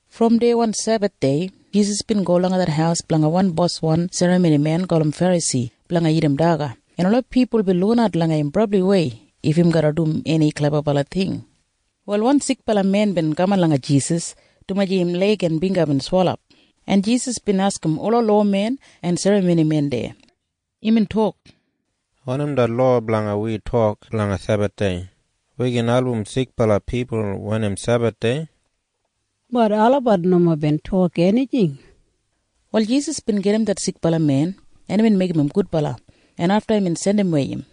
Brom deya wan Sebathdei Jisas bin go langa det haus blanga wan boswan serramonimen gulum Ferasi blanga dagat daga, en ola pipul bin lukinat langa im brabliwei if im garra dum eni klebabala ting. Wal wan sikbala men bin kaman langa Jisas, dumaji im leig en bingga bin swelap, en Jisas bin askim ola lowamen en serramonimen deya. Imbin tok, “Wanim det lowa blanga wi tok blanga Sebathdei? Wi gin album sikbala pipul wen im Sebathdei?” Bat olabat nomo bin tok enijing. Wal Jisas bin gajim det sikbala men, en imbin meigim im gudbala, en afta imbin jandimwei im.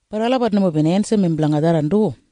Bat olabat nomo bin ensim im blanga tharran du.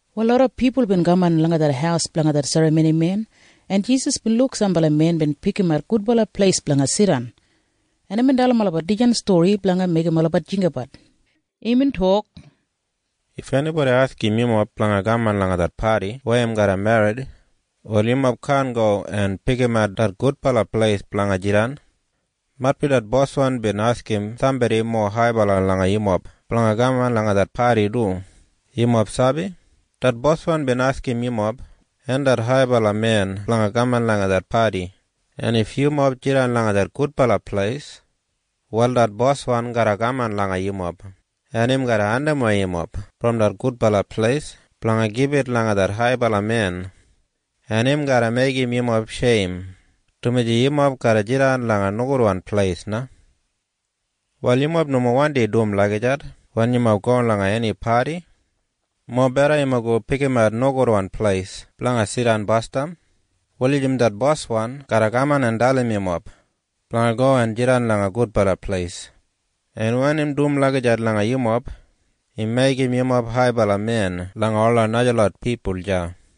Wal loda pipul bin kaman langa det haus blanga det serramonimen, en Jisas bin luk sambala men bin pikimat gudbala pleis blanga jidan, en imbin dalim olabat dijan stori blanga meigim olabat jinggabat. Imbin tok, “If enibodi askim yumob blanga kaman langa det padi weya im garra merrit, wal yumob kaan go en pikimat det gudbala pleis blanga jidan. Maitbi det boswan bin askim sambodi mowa haibala langa yumob blanga kaman langa det padi du. “Yumob sabi? Det boswan bin askim yumob en det haibala men blanga kaman langa det padi, en if yumob jidan langa det gudbala pleis, wal det boswan garra kaman langa yumob, en im garra andimwei yumob brom det gudbala pleis blanga gibit langa det haibala men, en im garra meigim yumob sheim, dumaji yumob garra jidan langa nogudwan pleis na. “Wal yumob nomo wandi dum lagijat wen yumob go langa eni padi. Mobeda yumob go en pikimat nogudwan pleis blanga jidan basdam wulijim det boswan garra kaman en dalim yumob blanga go en jidan langa gudbala pleis. En wen im dum lagijat langa yumob, im meigim yumob haibala men langa ola najalot pipul deya.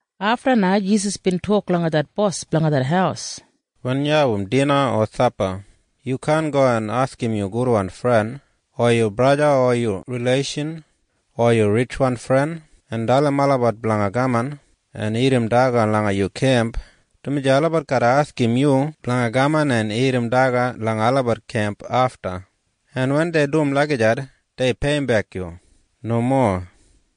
Afta na Jisas bin tok langa det bos blanga det haus, “Wen yu abum dina o sapa, yu kaan go en askim yu gudwan fren o yu braja o yu rileishan o yu ritjwan fren en dalim olabat blanga kaman en dagat langa yu kemp, dumaji olabat garra askim yu blanga kaman en dagat langa olabat kemp afta, en wen dei dum lagijat, dei peiyimbek yu. Nomo.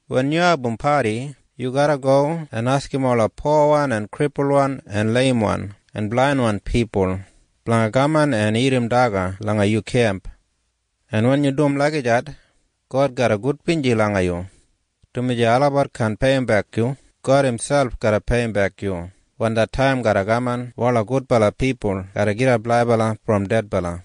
Wen yu abum padi, yu garra go en askim ola powan en kripulwan en leimwan en blainwan pipul blanga kaman en dagat langa yu kemp, en wen yu dum lagijat, God garra gudbinji langa yu, dumaji olabat kaan peiyimbek yu. God imselp garra peiyimbek yu wen det taim garra kaman weya ola gudbala pipul garra gidap laibala brom dedbala.”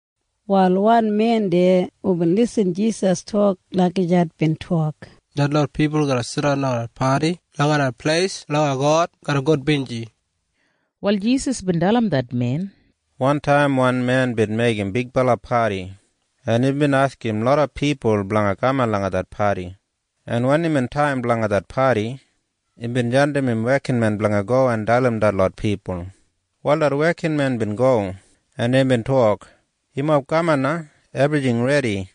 Wal wan men deya hubin irrim Jisas tok lagijat bin tok, “Detlot pipul hu garra jidan langa det padi langa det pleis blanga God garra gudbinji!” Wal Jisas bin dalim det men, “Wantaim wan men bin meigim bigbala padi, en imbin askim loda pipul blanga kaman langa det padi, en wen imbin taim blanga det padi, imbin jandim im wekinmen blanga go en dalim detlot pipul. “Wal det wekinmen bin go, en imbin tok, ‘Yumob kaman na! Ebrijing redi!’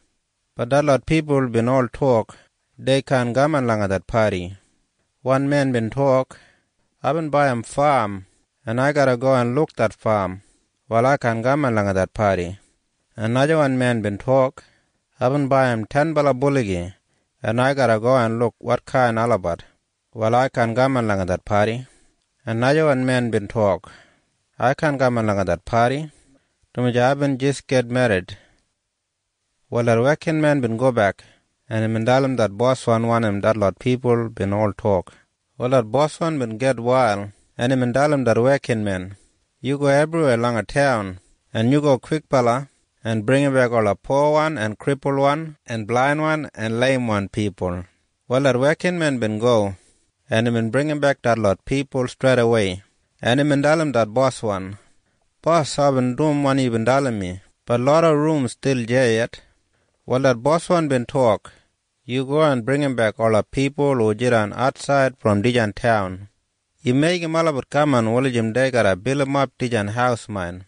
Bat detlot pipul bin ol tok dei kaan kaman langa det padi. Wan men bin tok, ‘Aibin baiyim fam, en ai garra go en luk det fam. Wal ai kaan kaman langa det padi.’ En najawan men bin tok, ‘Aibin baiyim tenbala buligi, en ai garra go en luk wotkain olabat. Wal ai kaan kaman langa det padi.’ En najawan men bin tok, ‘Ai kaan kaman langa det padi, dumaji aibin jis git merrit.’ “Wal det wekinmen bin gobek, en imbin dalim det boswan wanim detlot pipul bin ol tok, en det boswan bin gitwail, en imbin dalim det wekinmen, ‘Yu go ebriweya langa taun, en yu go kwikbala en bringimbek ola powan en kripulwan en blainwan en leimwan pipul.’ “Wal det wekinmen bin go, en imbin bringimbek detlot pipul streidawei, en imbin dalim det boswan, ‘Bos, aibin dum wanim yubin dalim mi. Bat loda rum stil deya yet.’ “Wal det boswan bin tok, ‘Yu go en bringimbek ola pipul hu jidan atsaid brom dijan taun. Yu meigim olabat kaman wulijim dei garra bilimap dijan haus main.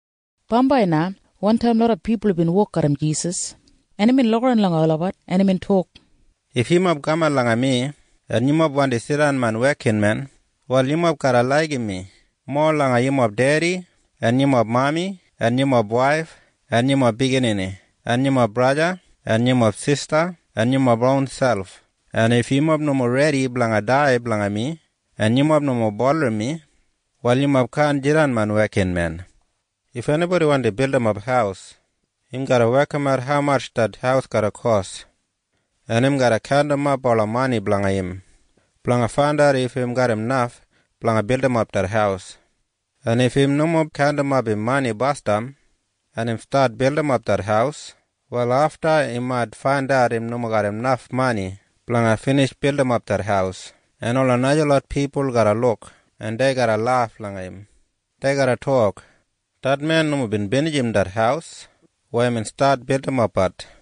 Bambai na wantaim loda pipul bin wok garram Jisas, en imbin lukaran langa olabat, en imbin tok, “If yumob kaman langa mi, en yumob wandi jidan main wekinmen, wal yumob garra laigim mi mowa langa yumob dedi en yumob mami en yumob waif en yumob biginini en yumob braja en yumob sista en yumob ronselp. En if yumob nomo redi blanga dai blanga mi, en yumob nomo bulurrum mi, wal yumob kaan jidan main wekinmen. “If enibodi wandi bildimap haus, im garra wekimat haumatj det haus garra kos, en im garra kaundimap ola mani blanga im blanga faindat if im garram naf blanga bildimap det haus. En if im nomo kaundimap im mani basdam, en im stat bildimap det haus, wal afta im mait faindat im nomo garram naf mani blanga binij bildimap det haus, en ola najalot pipul garra luk, en dei garra laf langa im. Dei garra tok, ‘Det men nomo bin binijim det haus weya imbin stat bildimapbat!’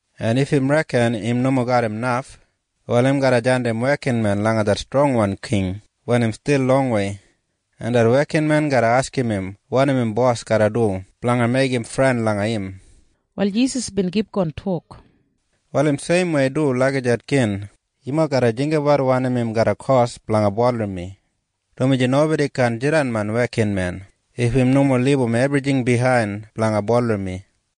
En if im reken im nomo garram naf, wal im garra jandim wekinmen langa det strongwan king wen im stil longwei, en det wekinmen garra askim im wanim im bos garra dum blanga meigim fren langa im.” Wal Jisas bin kipgon tok, “Wal im seimwei du lagijat gin. Yumob garra jinggabat wanim im garra kos blanga bulurrum mi, dumaji nobodi kaan jidan main wekinmen if im nomo libum ebrijing biyain blanga bulurrum mi.